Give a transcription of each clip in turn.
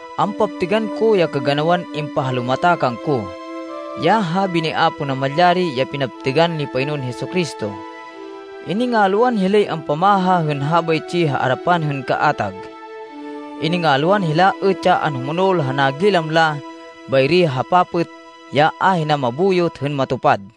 Ampaptêgan ko ya kaganawan impahalumata kangko, ya habi ni Apo Namalyari ya pinaptêgan ni Panginoon Jesu-Cristo. Iningalwan hilay ampamaha hên habaytsi ha arapan hên kaatag. Iningalwan hila êt ya anhumonol ha nagilam la bayri ha papêt, ya ahina mabuyot hên matupad.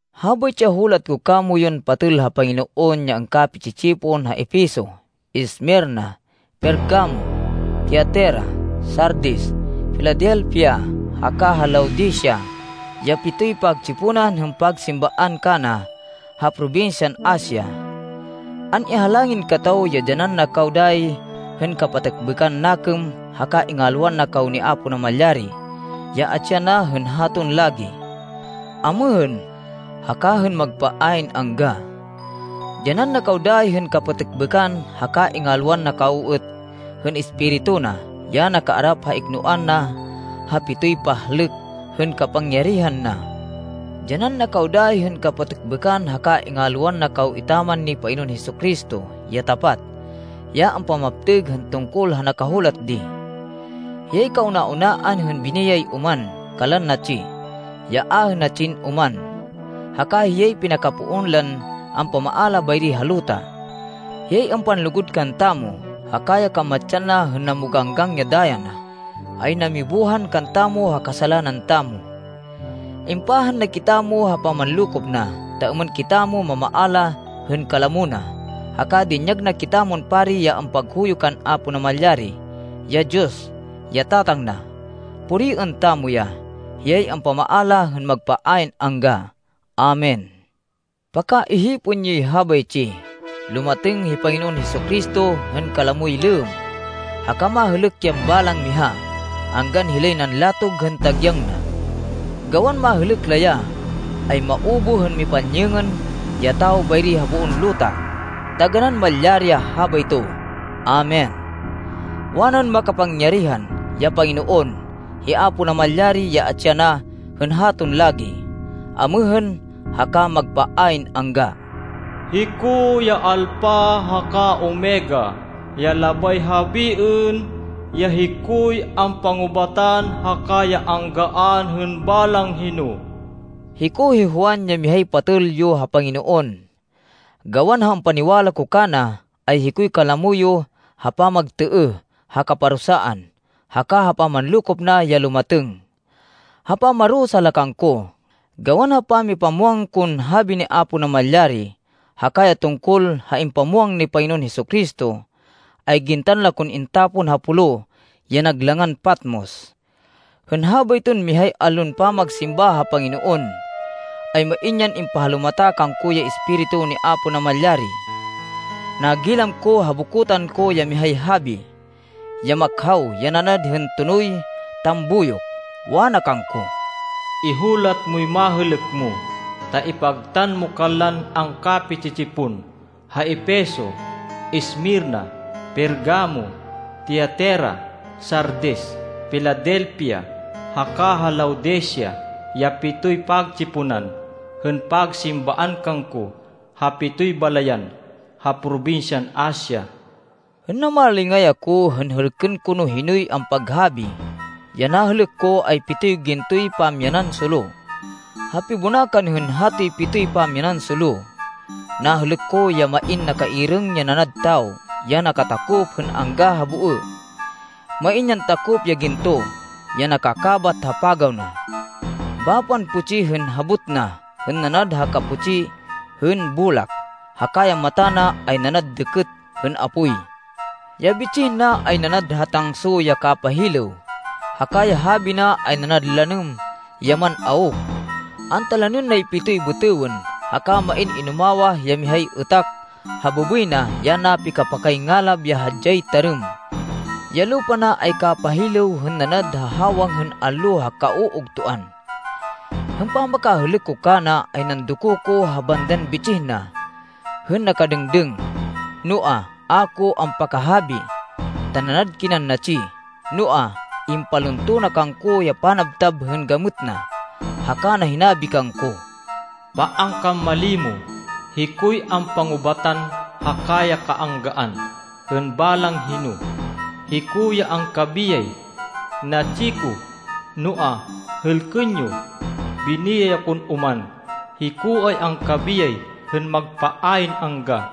Habaytsi ya hulat ko kamoyun patêl ha Panginoon ya angkapi-tsi-tsipon ha Efeso, Esmirna, Pergamo, Tiatira, Sardis, Filadelfia haka ha Laodicea ya pitoy pagtsiponan hên pagsimbaan kana ha probinsyan Asia. An-ihalangin kataw ya dyanan na kaw dayi hên kapatêkbêkan nakêm haka ingalwan na kaw ni Apo Namalyari, ya atsi yana hên haton lagi, amêhên, haka hên magpa ayn angga. Dyanan na kaw dayi hên kapatêkbêkan haka ingalwan na kaw êt hên Espiritu na, ya nakaarap ha iknoan na ha pitoy pahlêk hên kapangyarihan na. Dyanan na kaw dayi hên kapatêkbêkan haka ingalwan na kaw etaman ni Panginoon Jesu-Cristo ya tapat, ya ampamaptêg hên tungkol ha nakahulat di. Hiyay kauna-unaan hên biniyay oman kanlan natsi, ya ahê natsin oman, haka hiyay pinakapoon lan ampamaala bayri ha luta. Hiyay ampanlugud kantamo haka ya kamatsan na hên namoganggang ya daya na, ay namibuhan kantamo ha kasalanan tamo. Impahan na kitamo ha pamanlokop na, ta êmên kitamo mamaala hên kalamo na, haka dinyag na kitamon pari ya ampaghuyo kan Apo Namalyari, ya Diyos, ya Tatang na. Puriên tamo ya! Hiyay ampamaala hên magpa ayn angga! Amen. Pakaihipên yoy habaytsi! Lumatêng hi Panginoon Jesu-Cristo hên kalamoy lêmm, haka mahêlêk yan balang miha, anggan hilay nanlatog hên tagyang na. Gawan mahêlêk la ya, ay maubuh hên mipanyêngên ya tawo bayri ha boon luta. Taganán malyari ya habayto. Amen. Wanan Makapangyarihan, ya Panginoon, hi Apo Namalyari, ya atsi yana hên haton lagi, amêhên, haka magpa ayn angga, “Hiko ya Alpha haka Omega, ya labay habiên, ya hikoy ampangubatan haka ya anggaan hên balang hino.” Hiko hi Juan, ya mihay patêl yo ha Panginoon. Gawan ha ampaniwala ko kana, ay hikoy kalamo yo ha pamagtêêh ha kaparusaan, haka ha pamanlokop na ya lumatêng. Ha pamarusa la kangko, gawan ha pamipamwang kon habi ni Apo Namalyari, haka ya tungkol ha impamwang ni Panginoon Jesu-Cristo, ay gintan la kon intapon ha pulo ya nag langan Patmos. Hên habayton mihay allon pamagsimba ha Panginoon, ay main yan impahalumata kangko ya Espiritu ni Apo Namalyari. Nagilam ko ha bokotan ko ya mihay habi, ya makhaw, ya nanad hên tonoy tambuyok. Wana kangko, “Ihulat moy mahêlêk mo, ta ipagtan mo kanlan angkapi-tsi-tsipon, ha Efeso, Esmirna, Pergamo, Tiatira, Sardis, Filadelfia haka ha Laodicea ya pitoy pagtsiponan hên pagsimbaan kangko ha pitoy balayan ha probinsyan Asia.” Hên namalingay ako, hên hêlkên ko no hinoy ampaghabi, ya nahêlêk ko ay pitoy gintoy pamyanan solo. Ha pibonakan hên hatoy pitoy pamyanan solo, nahêlêk ko ya main nakairêng ya nanad tawo, ya nakatakop hên angga ha boê. Main yan takop ya ginto, ya nakakábat ha pagaw na. Bapan putsi hên habot na hên nanad ha kaputsi hên bolak, haka ya mata na ay nanad dêkêt hên apoy. Ya bitsih na ay nanad ha tangso ya kapahilêw, haka ya habi na ay nanad lanêm ya man-awk. Antalanên nay pitoy bêtêwên, haka main inumawah ya mihay êtak ha bêbêy na ya napikapakay ngalab ya hadyay tarêm. Ya lupa na ay kapahilêw hên nanad ha hawang hên allo ha kauugtoan. Hên pamakahêlêk ko kana ay nandoko ko ha bandan bitsih na hên nakadêngdêng, noa, a ko ampakahabi, ta nanad kinan natsi. Noa, impalunto na kangko ya panabtab hên gamêt na, haka na hinabi kangko, “Paan kan malimo! Hikoy ampangubatan haka ya kaanggaan hên balang hino. Hiko ya angkabiyay. Natsi ko. Noa, hêlkên yo! Biniyay akon oman! Hiko ay angkabiyay hên magpa ayn angga.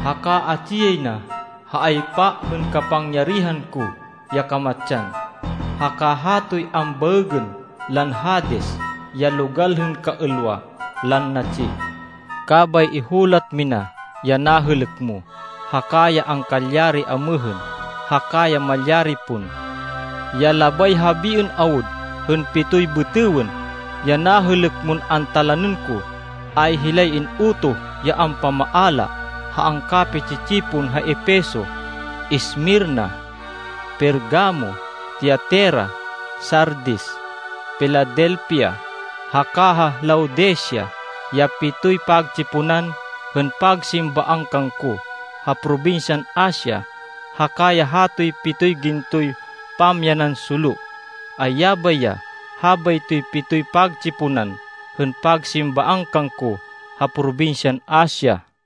Haka atsi yay na ha aypa hên kapangyarihan ko ya kamatsan, haka hatoy ambaêgên lan Hades ya logal hên kaêlwa lan natsi. Kabay ihulat mina ya nahêlêk mo, haka ya angkalyari amêhên, haka ya malyari pon. Ya labay habiên awud hên pitoy bêtêwên, ya nahêlêk mon antalanên ko, ay hilay in-utoh ya ampamaala ha angkapi-tsi-tsipon ha Efeso, Esmirna, Pergamo, Tiatira, Sardis, Filadelfia haka ha Laodicea ya pitoy pagtsiponan hên pagsimbaan kangko ha probinsyan Asia. Haka ya hatoy pitoy gintoy pamyanan solo, ay yabay ya habaytoy pitoy pagtsiponan hên pagsimbaan kangko ha probinsyan Asia.”